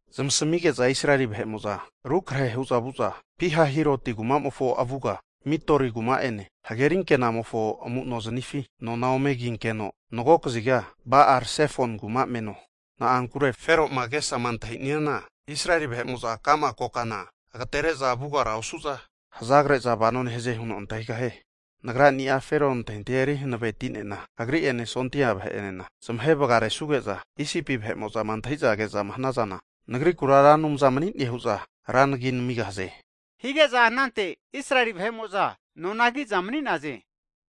Zmasamige'za Israeli vahe'mo'za rukrehe hu'za vu'za, Pihahiroti kumamofo avuga Mikdoli kuma'ene hagerinke'namofo amu'noznifi, nona ome kinkeno mago kaziga Ba'al Sifoni kuma meno. Na'ankure Fero'ma agesama antahi'niana, Israeli vahe'mo'za ka'ma kokana agatere'za vugara osu'za, hazagre'za vano nehaze huno antahigahie. Nagrani'a Fero antahintahia eri hanaveti'nena, agri'ene sondia vahe'anena zamahe vagaresuge'za, Isipi vahe'mo'zama antahi'za ke'za hanazana, Nagrikura Ra Anumza mani'ne hu'za ra nagia namigahaze. Hige'za anante Israeli vahe'mo'za nona ki'za mani'naze.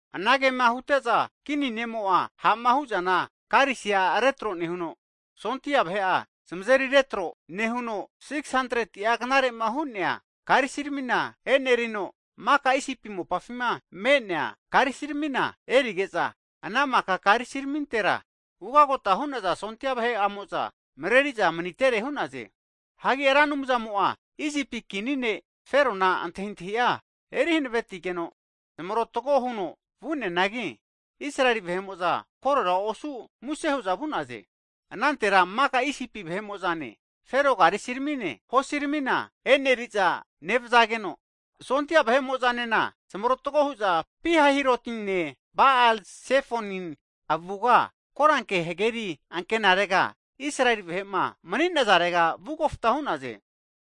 Anagema hute'za, kini ne'mo'a ha'ma hu'zana karisi'a retro nehuno, sondia vahe'a zamazeri retro, nehuno 600'a knare'ma hu'nea karisiramina e'nerino, maka Isipi mopafima me'nea karesiramina erige'za, ana maka karisiramintera ugagota hu'naza sondia vahe'amo'za mareri'za manitere hu'naze. Hagi Ra Anumzamo'a Isipi kini ne' Ferona antahintahia eri hanavetigeno zmarotago huno vu'neanagi, Israeli vahe'mo'za korera osu muse hu'za vu'naze. Anantera maka Isipi vahe'mo'zane, Fero karisi ramine, hosiramina e'neri'za nevazageno, sondia vahe'mo'zanena zamarotago hu'za Pihahirotine Ba'ale Zefone avuga, koranke hageri ankenarega Israeli vahe'ma mani'nazare vu kofta hu'naze.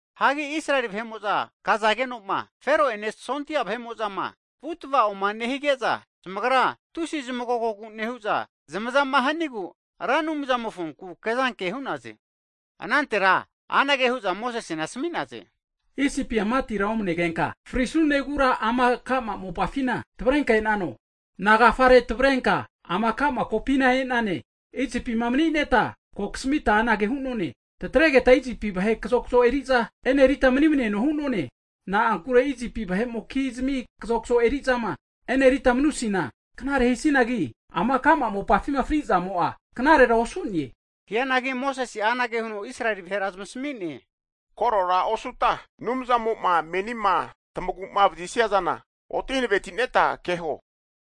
Hagi Israeli vahe'mo'za kazageno'ma, Fero'ene sondia vahe'amo'zama vu tava'oma nehige'za, zamagra tusi zamagogogu nehu'za, zamazama hanigu Ra Anumzamofonku kezanke hu'naze. Anantera anage hu'za Mosesena asami'naze, Isipia matira omnegenka frisunegura ama ka'ma mopafina tavrenka e'nano? Nagafare tavrenka ama ka'ma kopina e'nane? Isipima mani'neta ko kasamita anage hu'none, tataregeta Isipi vahe kazokzo eri'za e'nerita manimneno hu'none. Na'ankure Isipi vahe'mokizmi kazokzo eri'zama e'nerita manusina knare hisinagi, ama ka'ma mopafima fri'zamo'a knarera osu'ne. Hianagi Mosese'a anage huno Israeli vahera zamasami'ne, Korora osuta Anumzamo'ma menima tamagu'ma vazisia zana oti hanavetineta keho!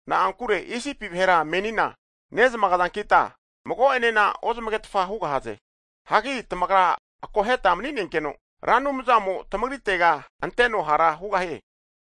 Na'ankure Isipi vahera menina nezmagazankita, mago'enena ozmagetfa hugahaze. Hagi tamagra akoheta mani'nenkeno, Ra Anumzamo tamagritega anteno hara hugahie.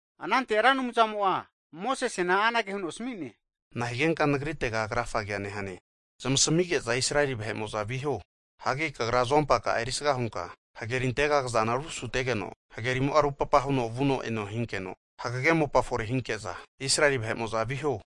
Anante Ra Anumzamo'a Mosesena anage huno asami'ne, Nahigenka Nagritega krafagea nehane? Zmasamige'za Israeli vahe'mo'za viho. Hagi kagra azompaka'a erisga hunka, hagerintega kazana rusutegeno, hagerimo'a rupapa huno vuno eno hinkeno, hagege mopa fore hinke'za, Israeli vahe'mo'za viho.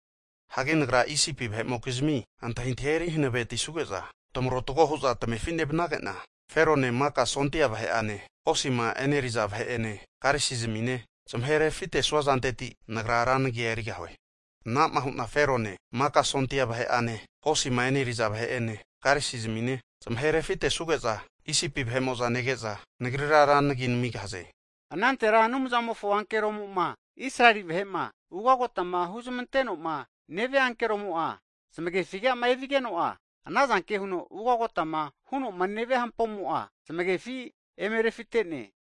Hagi Nagra Isipi vahe'mokizmi antahintahia eri hanavetisuge'za, tamarotago hu'za tamefi nevanage'na, Ferone maka sondia vahe'ane, hosima e'neri'za vahe'ene, karisizmine, zamahe refitesua zanteti, Nagra Ra nagia erigahue. Ana'ma hu'na Ferone maka sondia vahe'ane, hosima e'neri'za vahe'ene, karisizmine, zamahe refitesuge'za Isipi vahe'mo'za nege'za, Nagrira Ra nagi namigahaze. Anantera Anumzamofo ankeroma, Israeli vahe'ma ugagotama huzmanteno'ma nevia ankeromo'a zmagefi'ma evigeno'a, ana zanke huno ugagotama huno'ma nevia hampomo'a' zamagefi eme refite'ne.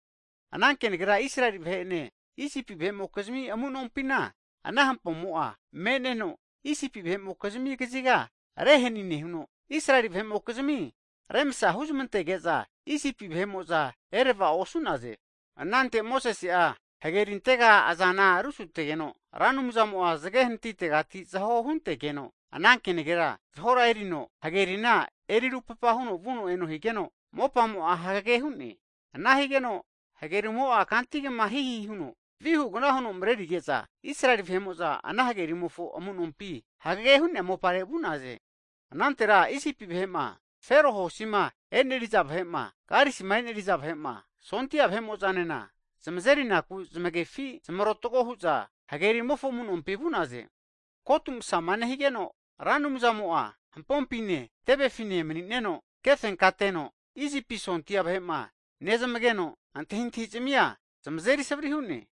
Ana kenagera Israeli vahe'ene Isipi vahe'mokizmi amu'nompina ana hampomo'a me'neno, Isipi vahe'mokizmi kaziga rehani nehuno, Israeli vahe'mokizmi remsa huzmantege'za Isipi vahe'mo'za erava'o osu'naze. Anante Mosese'a hagerintega azana rusutegeno, Ra Anumzamo'a zage hanatitegati zaho huntegeno, ana kenagera zaho erino hagerina eri rupapa huno vuno eno higeno, mopamo'a hagege hu'ne. Ana higeno hagerimo'a kantigma hihi huno vihu gna huno mreri'nege'za, Israeli vahe'mo'za ana hagerimofo amu'nompi hagege hu'nea mopare vu'naze. Anante Isipi vahe'ma, Fero hosima e'neriza vahe'ma, karisima e'neri'za vahe'ma, sondia nena, zamazeri naku zmagefi zmarotago hu'za hagerimofo amu'nompi vu'naze. Kotu masama nehigeno, Ra Anumzamo'a hampompine, tevefine mani'neno kefenkateno Isipi sondia vahe'ma nezmageno, antahintahizmia zamazeri savri hu'ne.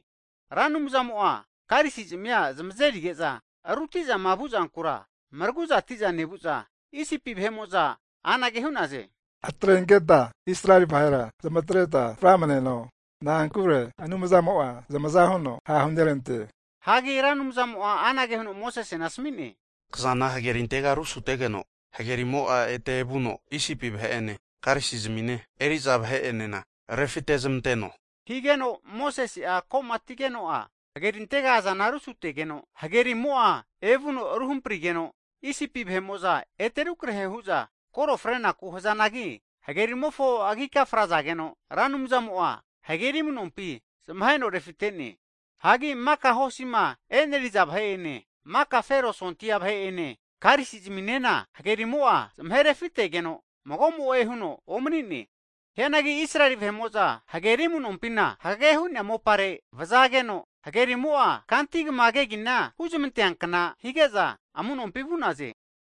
Ra Anumzamo'a karisizmia zamazeri ge'za ruti'zama vuzankura mragu'zati'za nevu'za, Isipi vahe'mo'za anage hu'naze, atrenketa Israeli vahera zmatreta framneno. Na'ankure Anumzamo'a zamaza huno ha' hunerante. Hagi Ra Anumzamo'a anage huno Mosesena asami'ne, Kazana hagerintega rusutegeno, hagerimo'a ete evuno Isipi vahe'ene karisizmine hosima eneri'za vahe'enana refitezmanteno. Higeno Mosese'a ko'matigeno'a hagerintega azana rusutegeno, hagerimo'a evuno ru hamprigeno, Isipi vahe'mo'za ete rukrehe hu'za koro frenaku hazanagi hagerimofo agika frazageno, Ra Anumzamo'a hageri amu'nompi zmaheno refite'ne. Hagi maka hosima e'neriza vahe'ene, maka Fero sondia vahe'ene karisi zminena hagerimo'a zmaherefitegeno, mago'mo'e huno omani'ne. Hianagi Israeli vahe'mo'za hageri amu'nompina hagege hu'nea mopare vazageno hagerimo'a, kantigma kegina huzmanteankna hige'za amu'nompi vu'naze.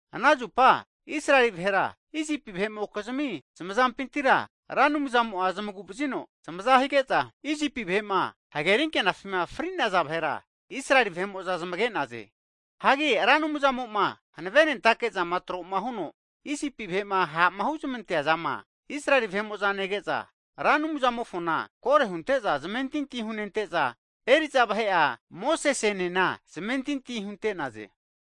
Ana zupa Israeli vahera Isipi vahe'mokizmi zamazampintira Ra Anumzamo'a zmagu'vazino zamaza hige'za, Isipi vahe'ma hagerinke'nafima fri'naza vahera Israeli vahe'mo'za zmage'naze. Hagi Ra Anumzamo'ma havenentake zama tro'ma huno Isipi vahe'ma ha'ma huzmantea zama, Israeli vahe'mo'za nege'za, Ra Anumzamofona kore hunte'za zamentinti hunente'za, eri'za vahe'a Mosesenena zamentinti hunte'naze.